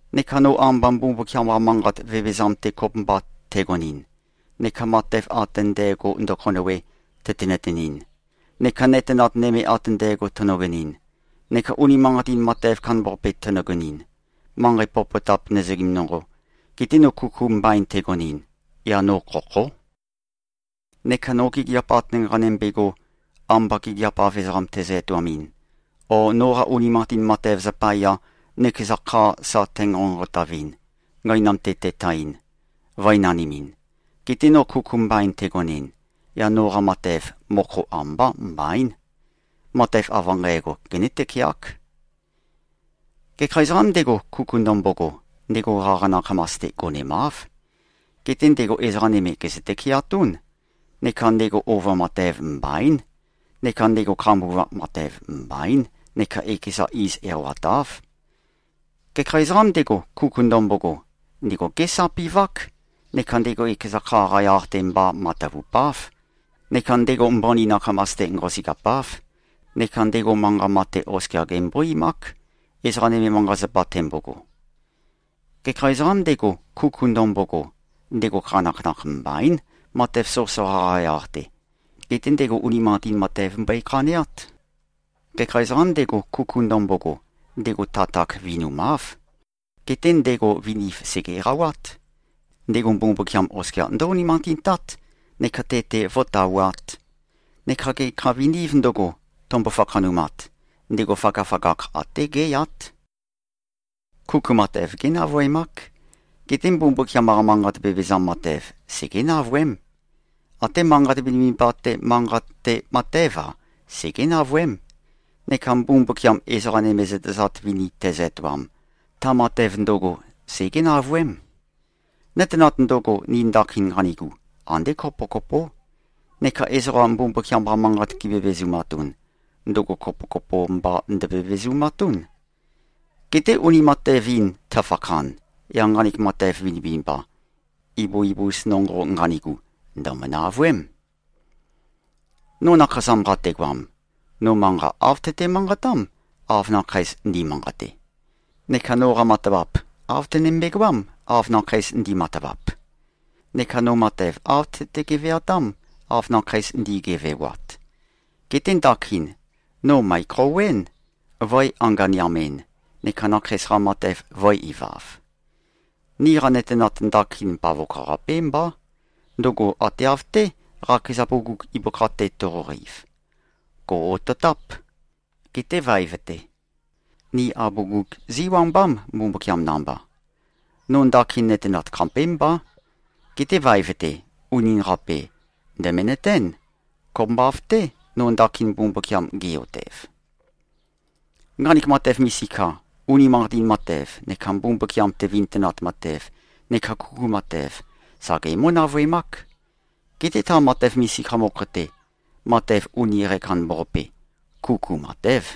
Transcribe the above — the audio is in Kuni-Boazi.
Neka no amba Mbumbukiam-qa manqat vevezam-te kopømba tægonɨn, neka matev ate ndægo, ndøkhonøwe, tøte-nøtenɨn, neka nøtenat nøme ate ndægo tønøgonɨn, neka unimanqatin matev kandambaqape tønøgonɨn, manqei popotap nøzøgim nonqo, geté no kuku mbain tægonɨn, yaq no khokhó. Neka no gigiap ate nqanømbe꞉go, amba gigiap-av ezoqam tæzø-etoamɨn, o noqa unimanqatin matev zapaya, nøkeza kha sa tænqonqotavɨn, gøinam-te tætaɨn, vø̄e-nanimɨn, getē no kuku mbain tægonɨn, yaq noqa matev, mokho ambá mbaín. Matev av nqægo, genǿ-tøkeák. Gekha ezoqām ndego, kuku ndømbogo, ndego qaqa nakhamas-te gonemáv. Geté ndego ezoqa nøme gèzø-tøkeatún. Neka ndego ova matev mbaín. Neka ndego khambuvap matev mbaín neka ekeza iz eqawatáv. Gekha ezoqām ndego, kuku ndømbogo, ndego gésapi꞉vák, neka ndego ekeza kha-qa yaq-te mba matavupáv, neka ndego mbøni nakhamas-te nqosøgeapáv, neka ndego manqa mate oskia gembó-eimák, ezoqa nøme manqa-zapa tembogo. Gekha ezoqām ndego, kuku ndømbogo, ndego khanakhanakh mbaín, matev soqøsoqa-qa yaq-te. Geté ndego unimanqatin matev mbøe-khaneát. Gekha ezoqām ndego, kuku ndømbogo, ndego tatak vinumáv. Geté ndego viniv sège-eqawát. Ndego Mbumbukiam oskia ndǿ-unimanqatintát neka te-te vó꞉tawāt. Neka gekha vinīv ndøgo, tømbo-fakhanumat, ndego føgøføgakh até géyát. Kuku matev génavøemák. Geté Mbumbukiam-qa manqat vevezam matev, segé-navøém. Até manqat vinivinimba-te manqate matév-a, segé-navøém. Neka Mbumbukiam ezoqa nøme zøtezat vini tezø-etoam, ta matev ndøgo segé-navøém. Nøtenat ndøgo, ni ndakin nqanigu, andé kopokopó. Neka ezoqa Mbumbukiam-qa manqat givevezumatun, ndøgo kopokopo mba ndøvevezumatún. Geté uni matev-in tøfakhan, yaq nqanek matev vinivinimba, ibu-ibus nonqo nqanigu, ndø̀mø-navøém. No nakhasam qategoam, no manqa āv tøte-manqatám, av nakheis ndi꞉manqate. Neka noqa matavap, āv tønømbe-goám, av nakheis ndi꞉matavap. Neka no matev āv tøte-geveatám, av nakheis ndi꞉gevewat. Geté ndakin, no mø̀ekhouwén, vø̄e-anganeam-en, neka nakheis-qa matev vø̄e-ivav. Niqa nøtenat ndakin bavokho-qapé mbá. Ndøgo ate av-té, qakeza bugug ibøkha-te toqoqeiv. Gò꞉-ototáp. Geté vaev-te, ni abugug zíwambám, Mbumbukiam namba. No ndakin nøtenat khapémbá. Geté vaev-te, unin-qape, ndø̀menøtén, kopømba av-té, no ndakin Mbumbukiam ge꞉-otev. Nqanek matev misika, unimanqatin matev, neka Mbumbukiam-te vintønat matev neka kuku matev, sa gemǿ-navøemák. Geté ta matev misika mokho-te, matev uni qækandambaqape, kuku matév.